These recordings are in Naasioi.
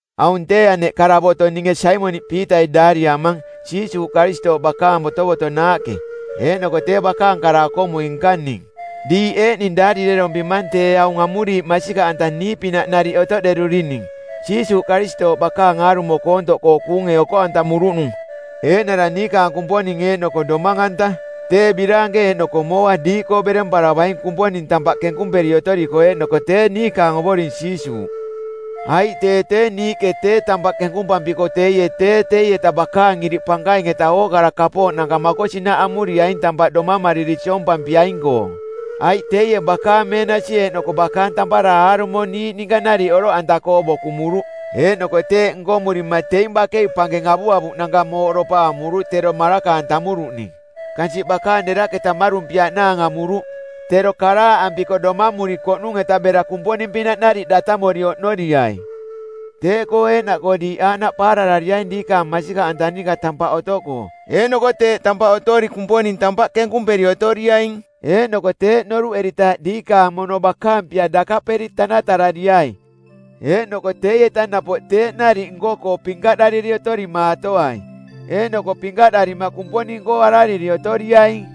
Aung tee aneꞌ karavoto˜ ninge Saimoniꞌ Piitai daariamang Jiisuuꞌ Karistooꞌ bakaang botovotonaaꞌke, eeꞌnoko tee bakaang kara-okomui-nka ning. Diiꞌ eeꞌning daarirerompimang tee aung amuriiꞌ masikaꞌanta niiꞌpinaꞌ nariꞌ otoꞌderurining Jiisuuꞌ Karistooꞌ bakaang aarumo koontoꞌkoo kuunge oko-antamuruꞌnung, eeꞌnara niikaang Kumponing eeꞌnoko Domang-anta. Tee biraanke eeꞌnoko mooa diiꞌkoo beremparavaing Kumponing tampaꞌ kenkumperi otoriko eeꞌnoko tee niikaang ovoring Jiisuuꞌ. Aiꞌ tee tee niiꞌke tee tampaꞌ kenkumpampiko teie tee teieta bakaang iriꞌ pankaing-eta ookara kapooꞌnanka makosinaꞌ amuriaing tampaꞌ domamariri siompampiaing-koo. Aiꞌ teie bakaang meenasi eeꞌnoko bakaang tampara aarumo niiꞌ ninka nariꞌ oroꞌanta-koo bokumuruꞌ. Eeꞌnoko teeꞌ nkomurima teing bakei pankeng avuavuꞌnanka mooꞌdopa amuruꞌ tero maraka-antamuruꞌning. Kansiꞌ bakaang deraꞌketa mmarumpiaꞌnaang amuruꞌ, tero karaaꞌampiko doomamurikoꞌnung-eta bera Kumponing-pinaꞌ nariꞌ datamori oꞌnoriai. Teeꞌkoo eeꞌnaꞌkoo diiꞌ aaꞌnaꞌ paararariaing diikaang masikaꞌanta ninka tampaꞌ otoꞌkoo, eeꞌnoko teeꞌ tampaꞌ otori Kumponing tampaꞌ kenkumperi otoriaing. Eeꞌnoko teeꞌ noruꞌeritaaꞌ diikaang mono bakaang pia dakaꞌperi tanatarariai. Eeꞌnoko teieta napoꞌ teeꞌ nariꞌ nko-koo pinkaꞌdariri otorimaatoai, eeꞌnoko pinkaꞌdarima Kumponing-koo arariri otoriaing.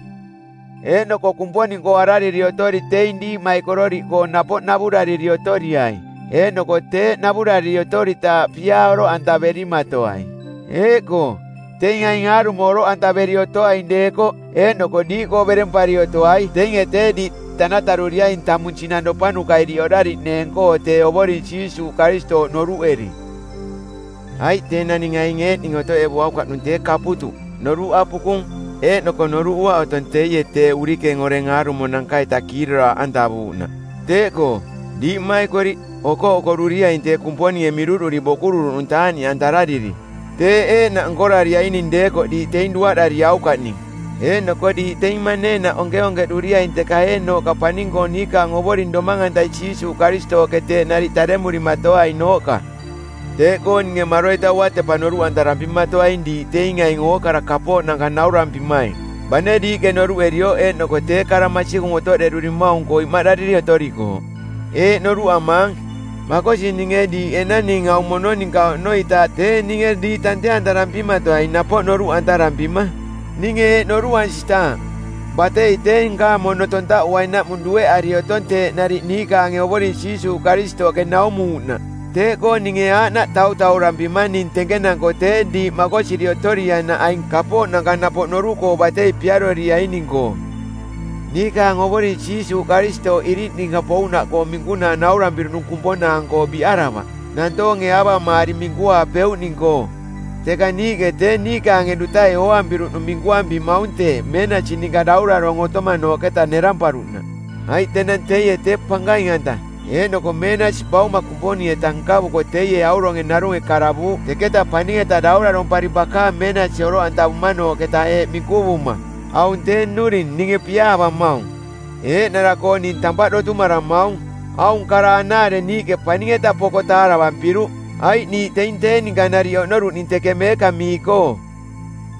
Eeꞌnoko Kumponing-koo arariri otori teing diiꞌmaikororiꞌkoo napoꞌ navurariri otoriai, eeꞌnoko teeꞌ navurariri otoritaaꞌ piaa oroꞌantaverimatoai. Eeꞌkoo, teing aing aarumo oroꞌantaveri otoaing deekoꞌ eeꞌnoko diiꞌkoo berempari otoai, teinge tee diiꞌ tanataruriaing tamung sinangropanuka iriꞌ oꞌdariꞌneeng-koo tee Ovoring Jiisuuꞌ Karistooꞌ noruꞌeri. Aiꞌ tee naning aing eeꞌning otoꞌevuaukaꞌnung tee kaputuꞌ, noruꞌ apukung, eeꞌnoko noruꞌuaꞌ otong teie tee urikeng oreng aarumonanka-ita kiiroraaꞌantavuuꞌnaꞌ. Teeꞌkoo, diiꞌ mmaikoriꞌ, okoꞌokoruriaing tee Kumponinge miruꞌduri bokururuꞌnung taaꞌniꞌantarariri. Teeꞌ eeꞌnaꞌ nkorariaining deekoꞌ diiꞌ teing duaꞌdariaukaꞌning. Eeꞌnoko diiꞌ teing maneenaꞌ onkeonkeꞌduriaing teka eeꞌnooꞌka paning-koo niikaang Ovoring Domang-antai Jiisuuꞌ Karistooꞌke teeꞌ nariꞌ taremurimato-ainooꞌka. Teeꞌkoo ninge maroita uatepa noruꞌantarampimatoaing diiꞌ teing aing ookara kapooꞌnanka naurampimaing, bane diiꞌke noruꞌerioꞌ eeꞌnoko tee kara masikung otoꞌderurimaung-koo imaꞌdariri otorikooꞌ. Eeꞌ noruꞌamaang, makosi ninge diiꞌ enang ning aung mono ninka oꞌnoitaaꞌ tee ninge diiꞌ tante-antarampimatoai napoꞌ noruꞌantarampima. Ninge eeꞌ noruꞌansitaaꞌ: Batei tee nkaang mono tontaꞌuainaꞌmung dueꞌari otong teeꞌ nariꞌ niikaange Ovoring Jiisuuꞌ Karistooꞌke naumuuꞌnaꞌ. Teeꞌkoo ninge aaꞌnaꞌ tautaurampimang ning tenkenanko tee diiꞌ makosiri otoriainaꞌ aing kapooꞌnanka napoꞌ noruꞌkoo batei piaroriaining-koo. Niikaang Ovoring Jiisuuꞌ Karistooꞌ iriꞌ ninka pouꞌnaꞌkoong minkunaa naurampiruꞌnung kumponaang-koo biꞌaravaꞌ, nantoonge aavamaari minkuaapeuꞌning-koo, teka niiꞌke tee niikaange dutai ooampiruꞌnung minkuampimaung teeꞌ meenasi ninka daurarong˜ otomanooꞌketa neramparuꞌnaꞌ. Aiꞌ tenang teie tee pankaing-anta eeꞌnoko meenasi Bauma Kumponing-eta nkavuko teie auronge narunge karavuuꞌ teketa paning-eta daurarompari bakaang meenasi oroꞌantavumanooꞌketa eeꞌ minkuvuma, “Aung tee nnuring ninge piaavamaung. Eeꞌnara-koo ning tampaꞌ dotumaramaung.” Aung kara anaare niiꞌke paning-eta poko taaravampiruꞌ, aiꞌ niiꞌ teing tee ninka nariꞌ oꞌnoruꞌning teke meekamii-koo.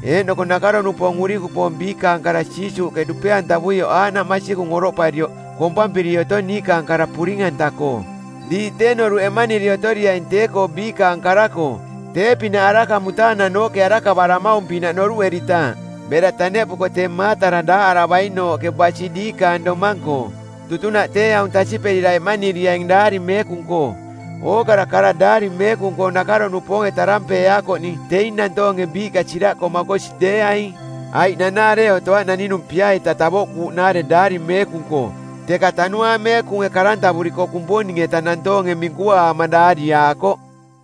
Eeꞌnoko nakaro-nupoong˜ urikupoong biikaang kara Jiisuuꞌke dupe-antavuioꞌ aaꞌnaꞌ masikung oroꞌparioꞌ kompampiri otong niikaang kara puring-anta-koo. Diiꞌ tee noruꞌ eꞌmaniri otoriaing tee-koo biikaang kara-koo tee-pinaꞌ araka mutaananooꞌke arakavaramaung-pinaꞌ noruꞌeritaaꞌ bera taneꞌpuko tee maatara daaꞌaravainooꞌke basi diikaang domang-koo. Tutunaꞌ tee aung tasiꞌperira eꞌmaniriaing Daari Meekung-koo: Ookara kara Daari Meekung-koo nakaro-nupoonge tarampeeaakoꞌning˜ teing nantoonge biiꞌka siraꞌkoo makosi deeaing. Aiꞌ nanaare otoaꞌ naninung pia-ita tavoꞌkuuꞌnaare Daari Meekung-koo, teka Tanuaang Meekunge karantavuriko˜ Kumponing-eta nantoonge minkuaama daariaakoꞌ.